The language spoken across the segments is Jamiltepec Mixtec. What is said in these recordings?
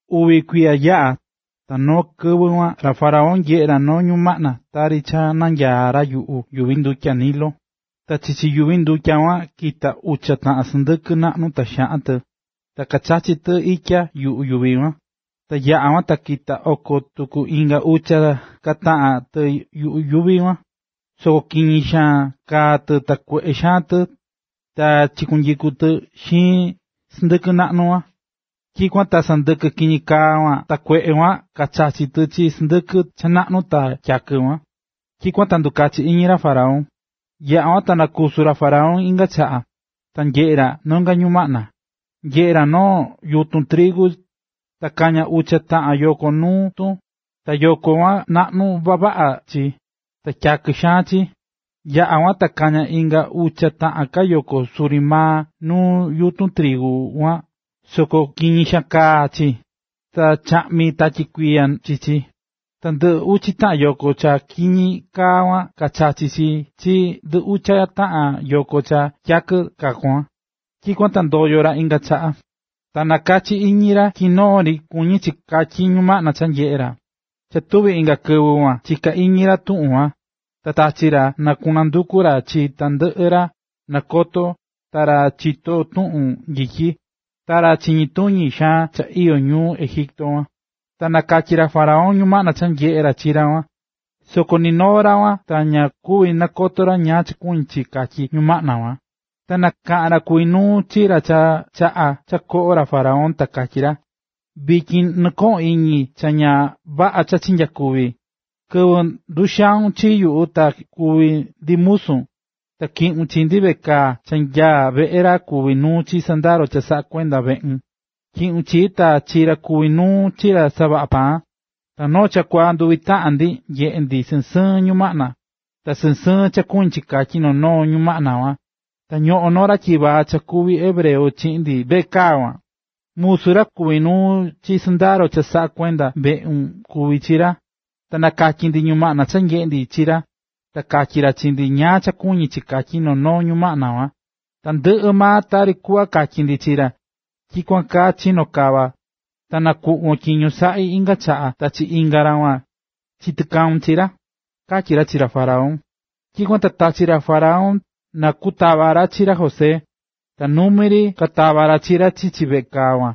Uvi kuiya yaꞌa̱, ta noo kɨvɨ kuan, ra faraón nyeꞌe̱ ra noo ñumaꞌna tari cha nanyaá ra yuꞌu yuvi ndutya Nilo. Ta chichi yuvi ndutya kuan kita̱ ucha taꞌan sɨndɨkɨ naꞌnu ta xaꞌan tɨ, ta kachachí tɨ itya yuꞌu yuvi kuan. Ta yaꞌa̱ kuan ta kita̱ koyo tuku inga ucha ka taꞌan tɨ yuꞌu yuvi kuan, soko kiñi xaan kaá tɨ ta kueꞌe xaan tɨ ta kachikuitayukú tɨ xiin sɨndɨkɨ naꞌnu kuan. Tyikuan ta sɨndɨkɨ kiñi kaa ta kueꞌe kuan kachachi̱ tɨ chi sɨndɨkɨ cha naꞌnu ta tyakɨ kuan. Tyikuan ta ndukachi̱ iñi ra faraón. Yaꞌa̱ kuan ta nakusu̱ ra faraón inga chaꞌa, ta nyeꞌe̱ ra nonga ñumaꞌna: Nyeꞌe̱ ra noo yutun trigu ta kaña̱ ucha taꞌan yoko nuu tun ta yoko kuan naꞌnu vavaꞌa chi ta tyakɨ xaan chi. Yaꞌa̱ kuan ta kaña̱ inga ucha ka taꞌan yoko suri maa nuu yutun trigu kuan soko kiñi xaan kaá chi, ta chaꞌmi̱ tatyi kuiya chi chi. Ta ndɨ ucha yoko cha kiñi kaa kuan kachachi̱ chi chi ndɨ ucha taꞌan yoko cha tyakɨ kaa kuan. Tyikuan ta ndoyo̱ ra inga chaꞌa. Ta nakachi̱ iñi ra tyi noo ri kuñí chi katyi ñumaꞌna cha nyeꞌe̱ ra. Cha tuvi̱ inga kɨvɨ kuan chiká iñi ra tuꞌun kuan, ta tachi̱ ra na kunduku ra chi tandɨꞌɨ ra nakotó ta ra chitó tuꞌun nyityi ta ra chiñí tuñi xaan cha iyó ñuu Egipto kuan. Ta nakatyí ra faraón ñumaꞌna cha nyeꞌe̱ ra chi ra kuan, soko ninoo maa ra ta ña kuví nakoto ra ñáá cha kuñí chi katyí ñumaꞌna kuan. Ta nakaꞌa̱n ra kuví nuu chi ra cha chaꞌá cha koꞌó ra faraón ta katyí ra: ―Vityin nɨkoꞌón iñi cha ña vaꞌa cha chinyakuvi̱. Kɨvɨ nduxau̱n chi nyuꞌu cha kuví ndi musun, ta tyiꞌu̱n chi ndi veꞌe kaa cha nyaá veꞌe ra kuví nuu chi sɨndaro cha saꞌakuendá veꞌun, tyiꞌu̱n chii ta chi ra kuvi̱ nuu chi ra kasavaꞌá paan. Ta noo chakuaa nduvi taꞌan ndi nyeꞌe̱ ndi sɨɨn sɨɨn ñumaꞌna. Ta sɨɨn sɨɨn cha kuñí chi katyi noo noo ñumaꞌna kuan. Ta ñoꞌón noo ra tyivaa cha kuví hebreo chiꞌin ndi veꞌe kaa kuan, musu ra kuví nuu chi sɨndaro cha saꞌakuendá veꞌun kuví chi ra. Ta nakatyi̱ ndi ñumaꞌna cha nyeꞌe̱ ndi chi ra, ta katyí ra chi ndi ñáá cha kuñí chi katyi noo noo numaꞌna kuan. Ta tandɨꞌɨ maa tari kuꞌva katyí ra chi ndi, tyikuan kaa chino̱ kava, ta nakuꞌvo̱n tyiño saꞌí inga chaꞌa ta chi inga ra kuan chitakau̱n chi ra ―katyí ra chi ra faraón. Tyikuan ta tachi̱ ra faraón na kutava ra chi ra José, ta numi ri katava̱ ra chi ra chichi veꞌe kaa kuan.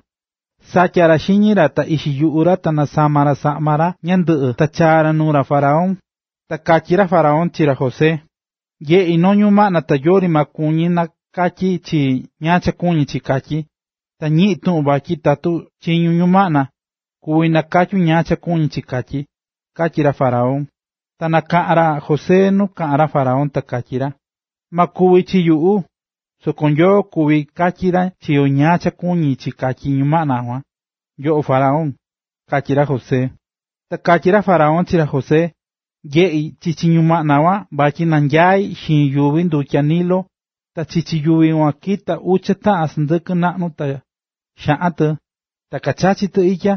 Satya̱ ra xiñi ra ta ixi yuꞌu ra ta nasama̱ ra saꞌma ra ñandɨꞌɨ ta chaa̱ ra nuu ra faraón. Ta katyí ra faraón chi ra José: ―Nyeꞌi̱ noo ñumaꞌna ta yori maa kuví nakatyi chii ñáá cha kuñí chi katyí. Ta ñiꞌi̱n tuꞌun vatyi tatu chiñún ñumaꞌna, kuví nakatyun ñáá cha kuñí chi katyí ―katyí ra faraón. Nakaꞌán ra José nu kaꞌán ra faraón, ta katyí ra: ―Ma kuvi chi yuꞌu, soko Nyoo kuví katyi ra chi yo ñáá cha kuñí chi katyi ñumaꞌna kuan, yoꞌo faraón ―katyí ra José. Ta katyí ra faraón chi ra José: ―Nyeꞌí chichi ñumaꞌna kuan vatyi nanyaí xiin yuvi ndutya Nilo. Ta chichi yuvi kuan kita̱ ucha taꞌan sɨndɨkɨ naꞌnu ta xaꞌan tɨ, ta kachachí tɨ itya.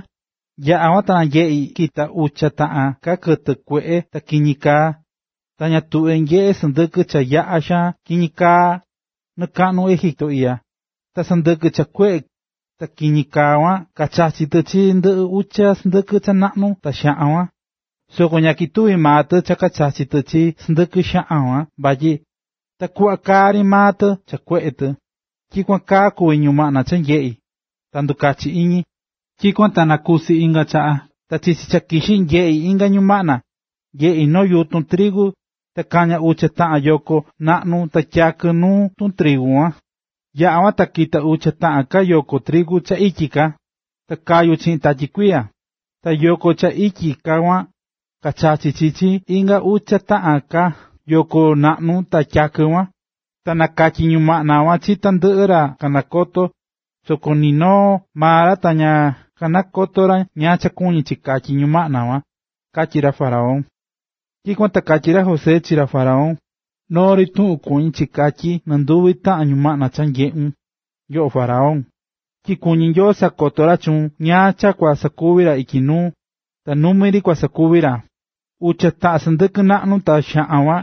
Yaꞌa̱ kuan, ta nyeꞌi̱ kita̱ ucha taꞌan ka kɨtɨ kueꞌe ta kiñi kaá tɨ, ña tuꞌve̱ nyeꞌé sɨndɨkɨ cha yaꞌa xaan kiñi kaa nɨkaꞌnu Egipto iꞌya. Ta sɨndɨkɨ kueꞌe ta kiñi kaa kuan, kachachi̱ tɨ chi ndɨ ucha sɨndɨkɨ cha naꞌnu ta tyakɨ kuan. Soko ña ketuvi̱ maa tɨ cha kachachi̱ tɨ chi sɨndɨkɨ xaꞌan kuan vatyi takuꞌva kaá ri maa tɨ cha kueꞌe tɨ. Tyikuan kaa kuví ñumaꞌna cha nyeꞌi̱, ta ndukachi̱ iñi. ”Tyikuan ta nakusi̱ inga chaꞌa, ta chichi cha kixí, nyeꞌi̱ inga ñumaꞌna. Nyeꞌi̱ noo yutun trigu ta kaña̱ ucha taꞌan yoko naꞌnu ta tyakɨ nu tutrigu kuan. Yaꞌa̱ kuan, ta kita̱ ucha taꞌan ka yoko trigu cha ityi kaá, ta kayu̱ chiꞌin tatyi kuiya. Ta yoko trigu cha ityi kaá kuan, kachachi̱ chi chi inga ucha taꞌan ka yoko trigu naꞌnu ta tyakɨ kuan. Ta nakatyi̱ ñumaꞌna kuan chi tandɨꞌɨ ra kanakotó, soko nɨ noo maa ra ta ña kanakoto̱ ra ñáá cha kuñí chi katyí ñumaꞌna kuan ―katyí ra faraón. Tyikuan ta katyí ra José chi ra faraón: ―Noo ri tuꞌun kuñí chi katyí nɨnduvi taꞌan ñumaꞌna cha nyeꞌu̱n, yoꞌo faraón. Tyi kuñí Nyoo sakoto ra chuun ñáá cha kua sakuvi ra ityi nuu, ta numi ri kusakuvi ra. Ucha taꞌan sɨndɨkɨ naꞌnu ta xaꞌan kuan,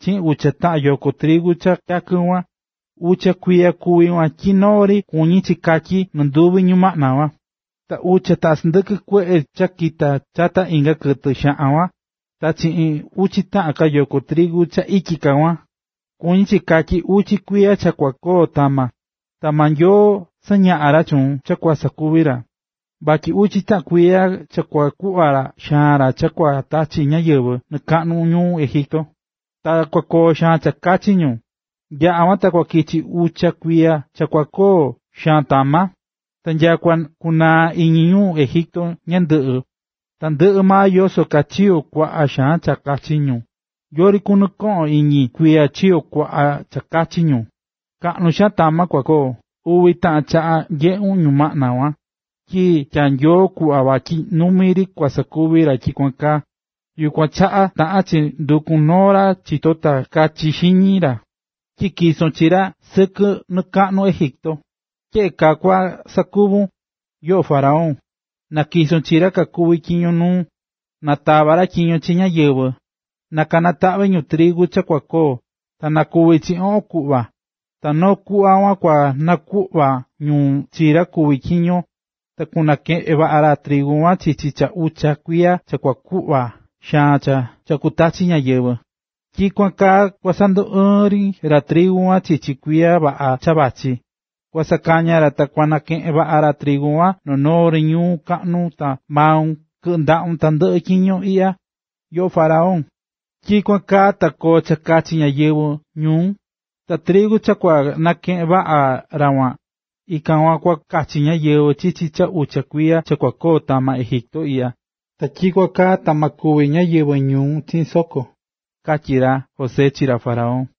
chiꞌin ucha taꞌan yoko trigu cha tyakɨ kuan, ucha kuiya kuví kuan tyi noo ri kuñí chi katyí nɨnduvi ñumaꞌna kuan. Ta ucha taꞌan sɨndɨkɨ kueꞌe cha kakita̱ chata inga kɨtɨ xaꞌan kuan, ta chiꞌin ucha taꞌan yoko trigu cha ityi kaá kuan, kuñí chi katyi ucha kuiya cha kua koo tama. Ta maa Nyoo sañaꞌá ra chuun cha kua sakuvi ra. Vachí ucha kuiya cha kua kuvaꞌa xaan cha kua tachi ñáyɨvɨ nɨkakaꞌnu Egipto, ta kua koo xaan cha kachi ñu. Yaꞌa̱ kuan ta kua kichi ucha kuiya cha kua koo xaan tama. Ta nyakua kunaa iñi ñu Egipto tandɨꞌɨ maa yoso kaa chiyo̱ kuaꞌa xaan cha kachachi̱ ñu. Yori kunɨkoꞌon iñi kuiya chiyo̱ kuaꞌa cha kachachi̱ ñu. Kaꞌnu xaan tama kua koo. Uvi taꞌan chaꞌa nyeꞌu̱n ñumaꞌna kuan, tyi cha tyaá Nyoo kuꞌva vatyi numi ri kua sakuvi ra tyikuan kaa. ”Yukuan chaꞌa taꞌan chi ndukun noo ra chitó ta kachi xiñi ra, ta tyison chi ra sɨkɨ nɨkaꞌnu Egipto. Tyeꞌe kaa kua sakuvun, yoꞌo faraón, na̱tyiso chi ra kakuví tyiño nuun, na tava ra tyiño chi ñáyɨvɨ, na kanataꞌvi ñu trigu cha kua koo, ta na kuvi chi oꞌon kuꞌva, ta noo kuꞌva kuan kua nakuꞌva ñu chi ra kuví tyiño, ta kunakeꞌen vaꞌa ra trigu kuan chichi cha ucha kuiya cha kua kuvaꞌa xaan cha kutachi ñáyɨvɨ. Ta tyikuan kaa kua sanduɨɨn ri ra trigu kuan chichi kuiya vaꞌa cha vachí, kua kasakaya ra ta kanakeꞌen vaꞌa ra trigu kuan noo noo ñuu kaꞌnu ta maun kɨꞌɨ ndaꞌa tandɨꞌɨ tyiño iꞌya, yoꞌo faraón. Tyikuan kaa ta koo cha kachi ñáyɨvɨ ñuun. Ta trigu cha kua nakeꞌen vaꞌa ra kuan, ikan kuan kua kachi ñáyɨvɨ chichi cha ucha kuiya cha kua koo tama Egipto iꞌya, ta tyikuan kaa ta ma kúvi ñáyɨvɨ ñuun chiꞌin soko ―katyí ra José chi ra faraón.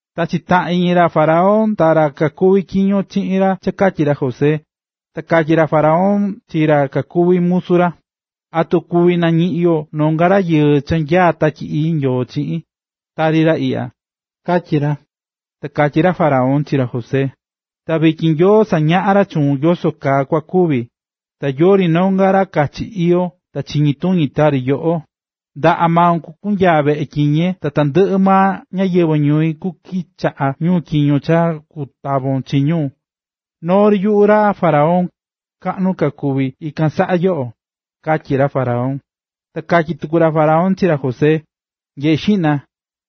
Ta chitaꞌa̱n iñi ra faraón ta ra kakuví tyiño chiꞌin ra cha katyí ra José. Ta katyí ra faraón chi ra kakuví musu ra: ―¿Atu kuvi nañiꞌin yo nonga rayɨɨ cha nyaá Tatyi Ii Nyoo chiꞌin, tari ra iꞌya? ―katyí ra. Ta katyí ra faraón chi ra José: ―Ta vityin Nyoo sañaꞌa̱ ra chuun yoso kaa kua kuvi, ta yori nonga ra kachi iyó ta chiñituñi tari yoꞌo. Ndaꞌa maun kua kunyaa veꞌe tyiñe, ta tandɨꞌɨ ñáyɨvɨ ñui kukichaꞌa ñu tyiño cha kutavon chi ñu. Noo ri yuꞌu, ra faraón, kaꞌnu ka kuví ikan saꞌa yoꞌo ―katyí ra faraón. Ta katyí tuku ra faraón chi ra José: ―Nyeꞌe xiꞌna,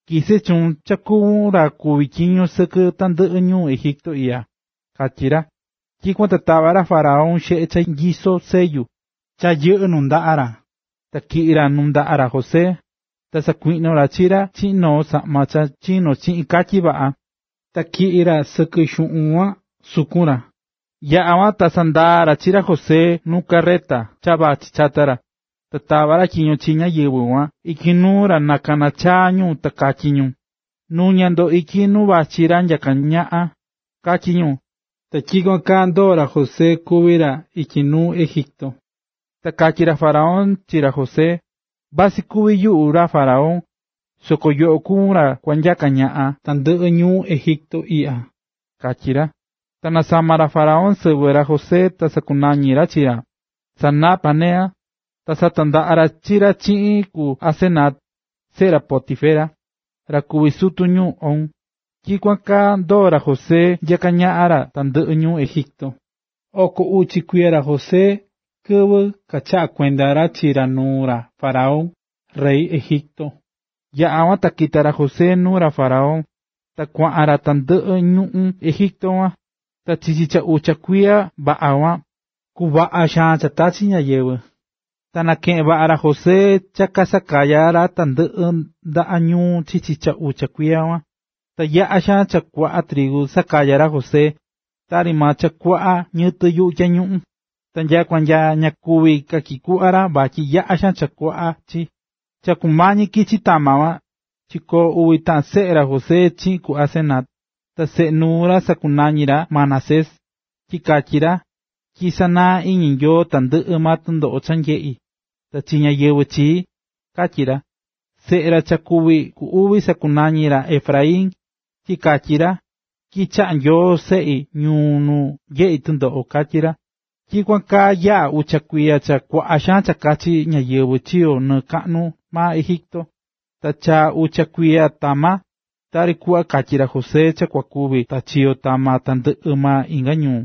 tyisé chuun cha kuvún ra kuví tyiño sɨkɨ tandɨꞌɨ ñuu Egipto iꞌya ―katyí ra. Tyikuan ta tava̱ ra faraón xeꞌe cha nyisó sellu, cha yɨꞌɨ́ nundaꞌa ra, ta tyiꞌi̱ ra nuu ndaꞌa ra José. Ta sakuiꞌno̱ ra chi ra chiꞌin noo saꞌma cha chino̱ chiꞌin katyi vaꞌa,a ta tyiꞌí ra sɨkɨ xuꞌun kuaan sukun ra. Yaꞌa̱ kuan ta sandaa̱ ra chi ra José nu carreta cha vachí chata ra, ta tava̱ tyiño ra chi ñáyɨvɨ kuaꞌan ityi nuu ra na kana chaa ñu ta katyí ñu: “¡Nu̱ña ndo ityi nu vachí ra nyaká ñaꞌan!”, katyí ñu. Ta tyikuan kaa ndoo̱ ra José kuví ra ityi nuu ñuꞌún Egipto. Ta katyí ra faraón chi ra José: ―Vasɨ kuví yuꞌu ra faraón, soko yoꞌo kuvún ra kua kunyaka ñaꞌan tandɨꞌɨ ñuu Egipto iꞌya ―katyí ra. Ta nasama̱ ra faraón sɨvɨ ra José ta sakunañi̱ ra chi ra, Zafnat-panea. Ta satandaꞌa̱ ra chi ra chiꞌin ku Asenat, seꞌe ra Potifera, ra kuví sutu ñuu On. Ta tyikuan kaa ndoo̱ ra José nyaká ñaꞌan ra tandɨꞌɨ ñuu Egipto. Oko uchi kuiya ra José kɨvɨ kachaꞌa̱ kuenda ra chi ra nuu ra faraón rey Egipto. Yaꞌa̱ kuan ta kita̱ ra José nuu ra faraón, ta kuaꞌan ra tandɨꞌɨ ñuꞌún Egipto kuan. Ta chichi cha ucha kuiya vaꞌa kuan, kuvaꞌa xaan cha tachi̱ ñáyɨvɨ. Ta nakeꞌe̱n vaꞌa ra José cha kasakaya̱ ra tandɨꞌɨ ndaꞌa ñuu chichi cha ucha kuiya kuan. Ta yaꞌa̱ xaan cha kuaꞌa trigu sakaya̱ ra José, tari maa cha kuaꞌa ñiyɨtɨ yuꞌu tyañuꞌun. Ta nyakua ña kuví ka tyikuꞌva ra, vatyi yaꞌa xaan kuaꞌa chi. Cha kumañi kichi tama kuan, chikoo̱ uvi taꞌan seꞌe ra José chiꞌin ku Asenat. Ta seꞌe nuu ra, sakunañi̱ ra Manasés, tyi katyí ra: “Tyi sanaá iñi Nyoo tandɨꞌɨ maa tɨndoꞌo cha nyeꞌi̱ ta chi ñáyɨvɨ chii”, katyí ra. Ta seꞌe ra cha ku uvi sakunañi̱ ra Efraín, tyi katyí ra: “Tyi chaꞌá Nyoo seꞌi ñuu nuu nyeꞌi̱ tɨndoꞌo”, katyí ra. Tyikuan kaa yaꞌa̱ ucha kuiya cha kuaꞌa xaan cha kachi ñáyɨvɨ chiyo̱ nɨɨ kaꞌnu maa Egipto. Ta chaa̱ ucha kuiya tama. Tari kuꞌva katyi̱ ra José cha kua kuvi ta chiyo̱ tama tandɨꞌɨ maa inga ñuu,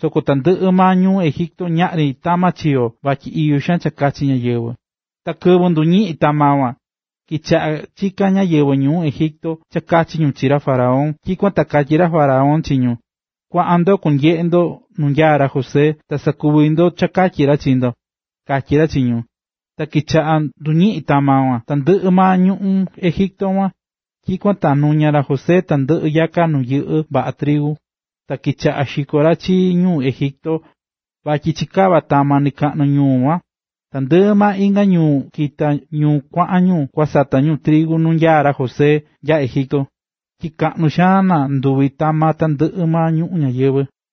soko tandɨꞌɨ maa ñuu Egipto ñaꞌri tama chiyo̱ vatyi iyó cha kachi ñáyɨvɨ. Kɨvɨ nduñiꞌi̱n tama kuan, kichaꞌá chikán ñáyɨvɨ ñuu Egipto cha kachi ñu chi ra faraón. Tyikuan ta katyí ra faraón chi ñu: “Kuaꞌan ndo kuanyeꞌe ndo nu nyaá ra José, ta sakuvi ndo cha katyi ra chi ndo”, katyí ra chi ñu. Ta kichaꞌa̱ nduñiꞌín tama kuan, tandɨꞌɨ maa ñuꞌún Egipto. Tyikuan ta nuña̱ ra José tandɨꞌɨ yaka nu yɨꞌɨ́ vaꞌa trigu, ta kichaꞌa̱ xikó ra chi ñu Egipto vatyi chikava̱ tama nɨkaꞌnu ñuu kuan. Tandɨꞌɨ maa inga ñuu kita̱ ñu kuaꞌan ñu kua sata ñu trigu nu nyaá ra José nya Egipto, tyi kaꞌnu xaan nanduvi̱ tama tandɨꞌɨ maa ñuꞌún ñayɨvɨ̱.